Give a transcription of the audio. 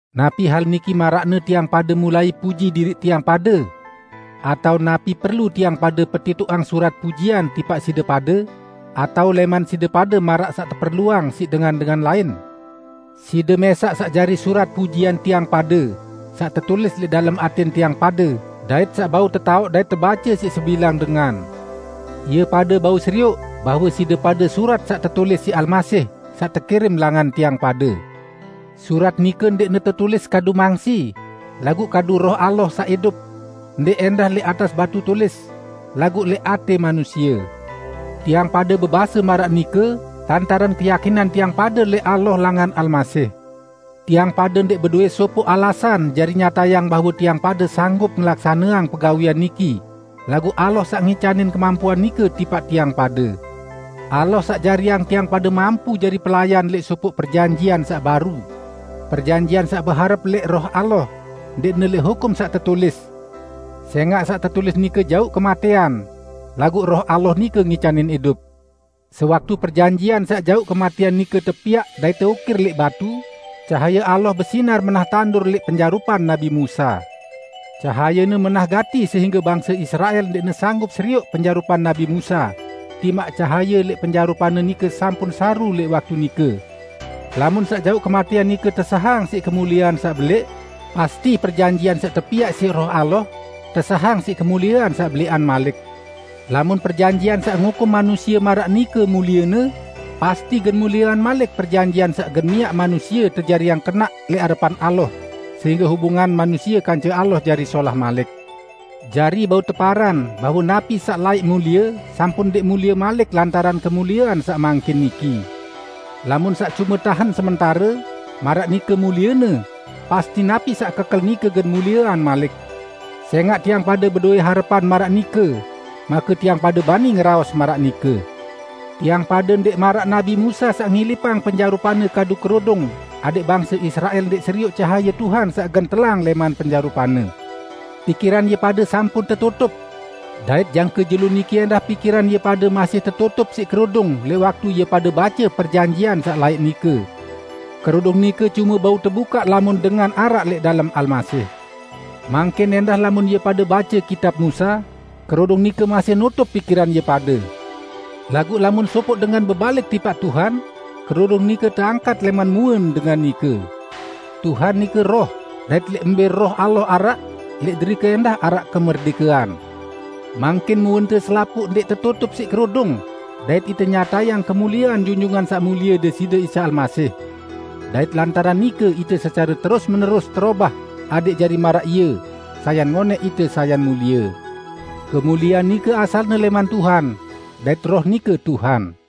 Napi hal niki maraqne tiang pade mulai puji diriq tiang pade? Atao napi perlu tiang pade petitoqang surat pujian tipaq side pade, atao lẽman side pade maraq saq teperluang siq dengan-dengan lain? Side mẽsaq saq jari surat pujian tiang pade, saq tetulis lẽq dalem atẽn tiang pade dait saq bau tetaoq dait tebace siq sebilang dengan. Ie pade bau serioq bahwe side pade surat saq tetulis siq Almasih, saq tekirim langan tiang pade. Surat nike ndẽqne tetulis kadu mangsi, laguq kadu Roh Allah saq idup; ndẽq ẽndah lẽq atas batu tulis, laguq lẽq atẽ manusie. Tiang pade bebase maraq nike lantaran keyakinan tiang pade lẽq Allah langan Almasih. Tiang pade ndẽq bedowẽ sopoq alasan jari nyatayang bahwe tiang pade sanggup ngelaksaneang pegawẽan niki, laguq Allah saq ngicanin kemampuan nike tipaq tiang pade. Allah saq jariang tiang pade mampu jari pelayan lẽq sopoq perjanjian saq baru; perjanjian saq beharep lẽq Roh Allah, ndẽqne lẽq hukum saq tetulis. Sẽngaq saq tetulis nike jauq kematẽan, laguq Roh Allah nike ngicanin idup. Sewaktu perjanjian saq jauq kematẽan nike tepiaq dait teukir lẽq batu, cahaye Allah besinar menah tandur lẽq penjarupan nabi Musa. Cahayene menah gati sehingge bangse Israel ndẽqne sanggup serioq penjarupan nabi Musa, timaq cahaye lẽq penjarupanne nike sampun saru lẽq waktu nike. Lamun saq jauq kematẽan nike tesahang siq kemuliean saq belẽq, pasti perjanjian saq tepiaq siq Roh Allah, tesahang siq kemuliean saq belẽqan malik. Lamun perjanjian saq ngukum manusie maraq nike muliene, pasti gen muliean malik perjanjian saq gen miaq manusie tejariang kenaq lẽq arepan Allah sehingge hubungan manusie kance Allah jari solah malik. Jari bau teparan bahwe napi saq laẽq mulie, sampun ndẽq mulie malik lantaran kemuliean saq mangkin niki. Lamun saq cume tahen sementare, maraq nike muliene, pasti napi saq kekel nike gen muliean malik. Sẽngaq tiang pade bedowẽ harepan maraq nike, make tiang pade bani ngeraos maraq nike. Tiang pade ndẽq maraq nabi Musa saq ngilipang penjarupanne kadu kerudung adẽq bangse Israel ndẽq serioq cahaye Tuhan saq gen telang lẽman penjarupanne. Pikiran ie pade sampun tetutup. Dait jangke jelo niki ẽndah pikiran ie pade masih tetutup siq kerudung lẽq waktu ie pade bace perjanjian saq laẽq nike. Kerudung nike cume bau tebukaq lamun dengan araq lẽq dalem Almasih. Mangkin ẽndah lamun ie pade bace kitab Musa, kerudung nike masih nutup pikiran ie pade. Laguq lamun sopoq dengan bebalik tipaq Tuhan, kerudung nike teangkat lẽman muen dengan nike. Tuhan nike Roh, dait lẽq mbẽ Roh Allah araq, lẽq derike ẽndah araq kemerdẽkean. Mangkin muente selapuq ndẽq tetutup siq kerudung, dait ite nyatayang kemuliean Junjungan Saq Mulie Deside Isa Almasih. Dait lantaran nike ite secare terus-menerus terobah adẽq jari maraq Ie; sayan ngonẽq ite sayan mulie. Kemuliean nike asalne lẽman Tuhan, dait Roh nike Tuhan.